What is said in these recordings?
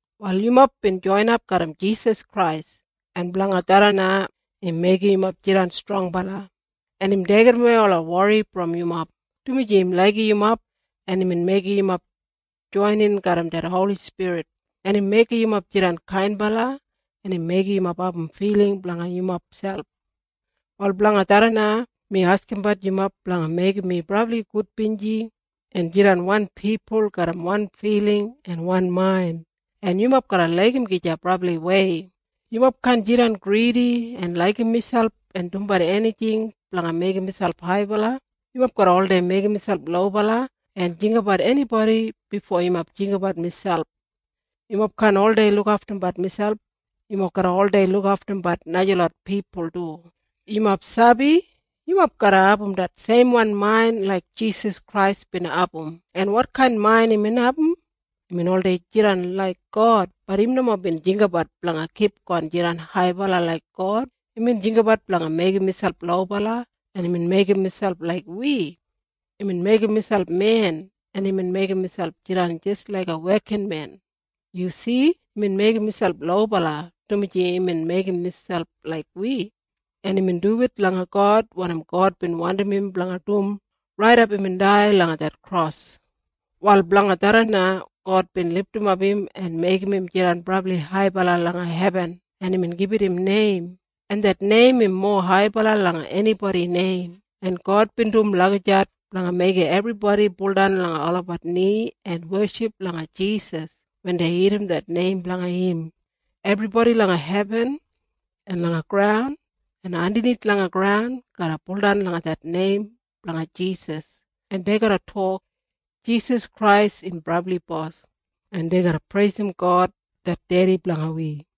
Wal yumob bin joinap garram Jisas Krais, en blanga tharran na im meigim yumob jidan strongbala, en im deigidawei ola wori brom yumob, dumaji im laigim yumob, en imbin meigim yumob joinin garram det Holi Spirit, en im meigim yumob jidan kainbala, en im meigim yumob abum filing blanga yumob selp. Wal blanga tharran na mi askimbat yumob blanga meigim mi brabli gudbinji en jidan wan pipul garram wan filing en wan main, en yumob garra laigim gija brabliwei. Yumob kaan jidan gridi en laigim miselp en dumbat enijing blanga meigim miselp haibala. Yumob garra oldei meigim miselp lobala en jinggabat enibodi bifo yumob jinggabat miselp. Yumob kaan oldei lukaftumbat miselp. Yumob garra oldei lukaftumbat najalot pipul du. Yumob sabi? Yumob garra abum det seimwan main laik Jisas Krais bin abum. En wotkain main imbin abum? Imbin oldei jidan laik God. Bat im nomo bin jinggabat blanga kipgon jidan haibala laik God. Imbin jinggabat blanga meigim miselp lobala, en imbin meigim miselp laik wi. Imbin meigim miselp men, en imbin meigim miselp jidan jis laiga wekinmen. Yu si? Imbin meigim miselp lobala, dumaji imbin meigim miselp laik wi, en imbin duwit langa God wanim God bin wandim im blanga dum raidap imbin dai langa det kros. Wal blanga tharran na God bin lidimap im en meigim im jidan brabli haibala langa hebin, en imbin gibit im neim, en det neim im mowa haibala langa enibodi neim. En God bin dum lagijat blanga meigim ebribodi buldan langa olabat ni en weship langa Jisas wen dei irrim det neim blanga im. Ebribodi langa hebin en langa graun en andanith langa graun garra baudan langa det neim blanga Jisas, en dei garra tok, “Jisas Krais im brabli Bos.” En dei garra preisim God det Dedi blanga wi.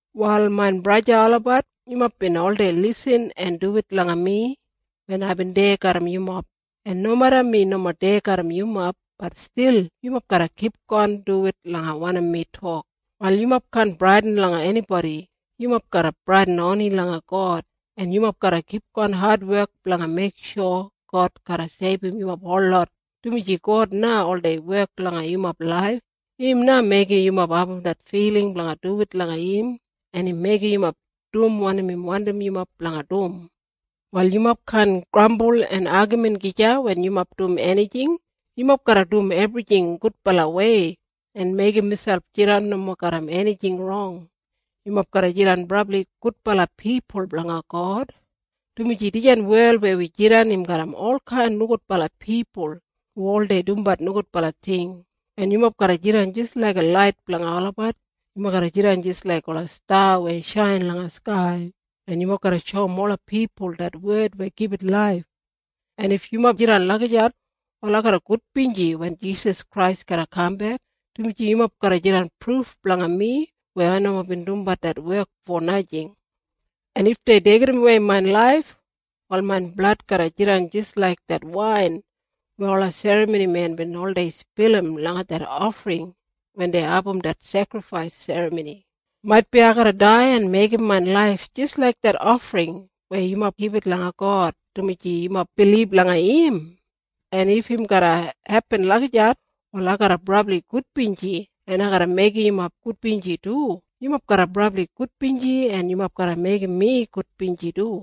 Wal main braja en sista olabat, yumob bin oldei lisin en duwit langa mi wen aibin deya garram yumob, en nomeda mi nomo deya garram yumob, bat stil yumob garra kipgon duwit langa wanim mi tok. Wal yumob kaan bradin langa enibodi. Yumob garra bradin oni langa God, en yumob garra kipgon adwek blanga meiksho God garra seibum yumob holot, dumaji God na oldei wek langa yumob laif. Im na meigim yumob abum det filing blanga duwit langa im, en im meigim yumob dum wanim im wandim yumob blanga dum. Wal yumob kaan grambul en agamin gija wen yumob dum enijing. Yumob garra dum ebrijing gudbalawei en meigim miselp jidan nomo garram enijing rong. Yumob garra jidan brabli gudbala pipul blanga God, dumaji dijan wel weya wi jidan im garram olkain nogudbala pipul hu oldei dumbat nogudbala ting, en yumob garra jidan jis laiga lait blanga olabat. Yumob garra jidan jis laik ola sta weya shain langa skai, en yumob garra shoum ola pipul det wed weya gibit laif. En if yumob jidan lagijat, wal ai garra gudbinji wen Jisas Krais garra kambek, dumaji yumob garra jidan pruf blanga mi weya ai nomo bin dumbat det wek fo najing. En if dei deigidawei main laif, wal main blad garra jidan jis laik det wain weya ola serramonimen bin oldei spilim langa det ofring wen dei abum det sekrifais serramoni. Maitbi ai garra dai en meigim main laif jis laik det ofring weya yumob gibit langa God dumaji yumob bilib langa im. En if im garra hepin lagijat, wal ai garra brabli gudbinji, en ai garra meigim yumob gudbinji du. Yumob garra brabli gudbinji, en yumob garra meigim mi gudbinji du.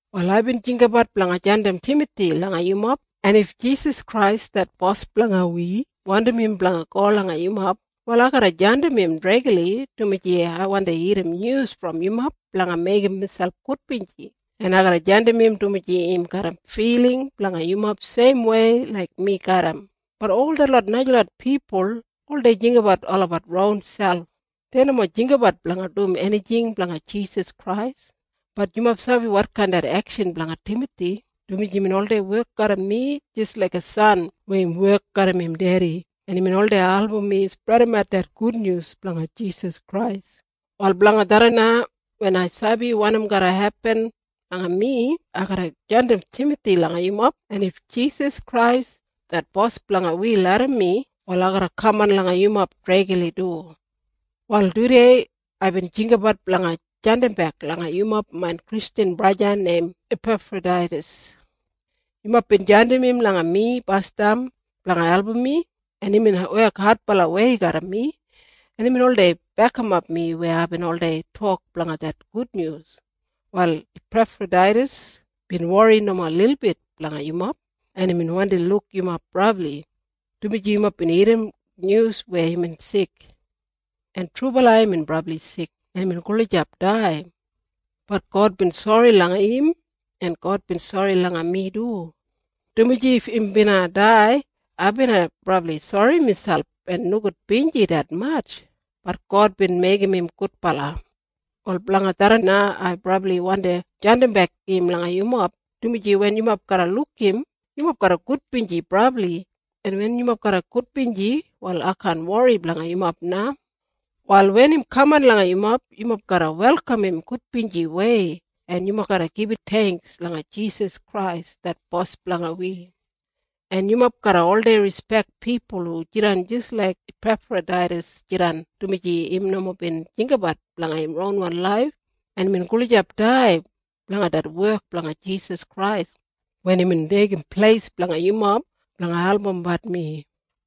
Wal aibin jinggabat blanga jandim Timathi langa yumob, en if Jisas Krais det Bos blanga wi wandim im blanga go langa yumob, wal ai garra jandim im dregli, dumaji ai wandi irrim nyus brom yumob blanga meigim miselp gudbinji, en ai garra jandim im dumaji im garram filing blanga yumob seimwei laik mi garram. Bat ol detlot najalot pipul oldei jinggabat olabat ronselp. Dei nomo jinggabat blanga dum enijing blanga Jisas Krais. Bat yumob sabi wotkain det ekshan blanga Timathi, dumaji imbin oldei wek garram mi jis laiga san weya im wek garram im dedi, en imbin oldei album mi spredimat det gudnyus blanga Jisas Krais. Wal blanga tharran na wen ai sabi wanim garra hepin langa mi, ai garra jandim Timathi langa yumob, en if Jisas Krais det Bos blanga wi larram mi, wal ai garra kaman langa yumob dregli du. Wal tudei aibin jinggabat blanga jandimbek langa yumob main Kristjan braja neim Ipefrodaitas. Yumob bin jandim im langa mi basdam blanga album mi, en imbin wek adbalawei garram mi, en imbin oldei bekimap mi weya aibin oldei tok blanga det gudnyus. Wal Ipefrodaitas bin wori nomo lilbit blanga yumob, en imbin wandi luk yumob brabli, dumaji yumob bin irrim nyus weya imbin sik. En trubala imbin brabli sik, en imbin gulijap dai. Bat God bin sori langa im, en God bin sori langa mi du, dumaji if im bina dai, ai bina brabli sori miselp en nogudbinji detmatj. Bat God bin meigim im gudbala. Wal blanga tharran na ai brabli wandi jandimbek im langa yumob, dumaji wen yumob garra luk im, yumob garra gudbinji brabli, en wen yumob garra gudbinji, wal ai kaan wori blanga yumob na. Wal wen im kaman langa yumob, yumob garra welkam im gudbinjiwei, en yumob garra gibit theingks langa Jisas Krais det Bos blanga wi, en yumob garra oldei rispek pipul hu jidan jis laik Ipefrodaitas jidan, dumaji im nomo bin jinggabat blanga im ronwan laif, en imbin gulijap dai blanga det wek blanga Jisas Krais wen imbin deigim pleis blanga yumob blanga albumbat mi.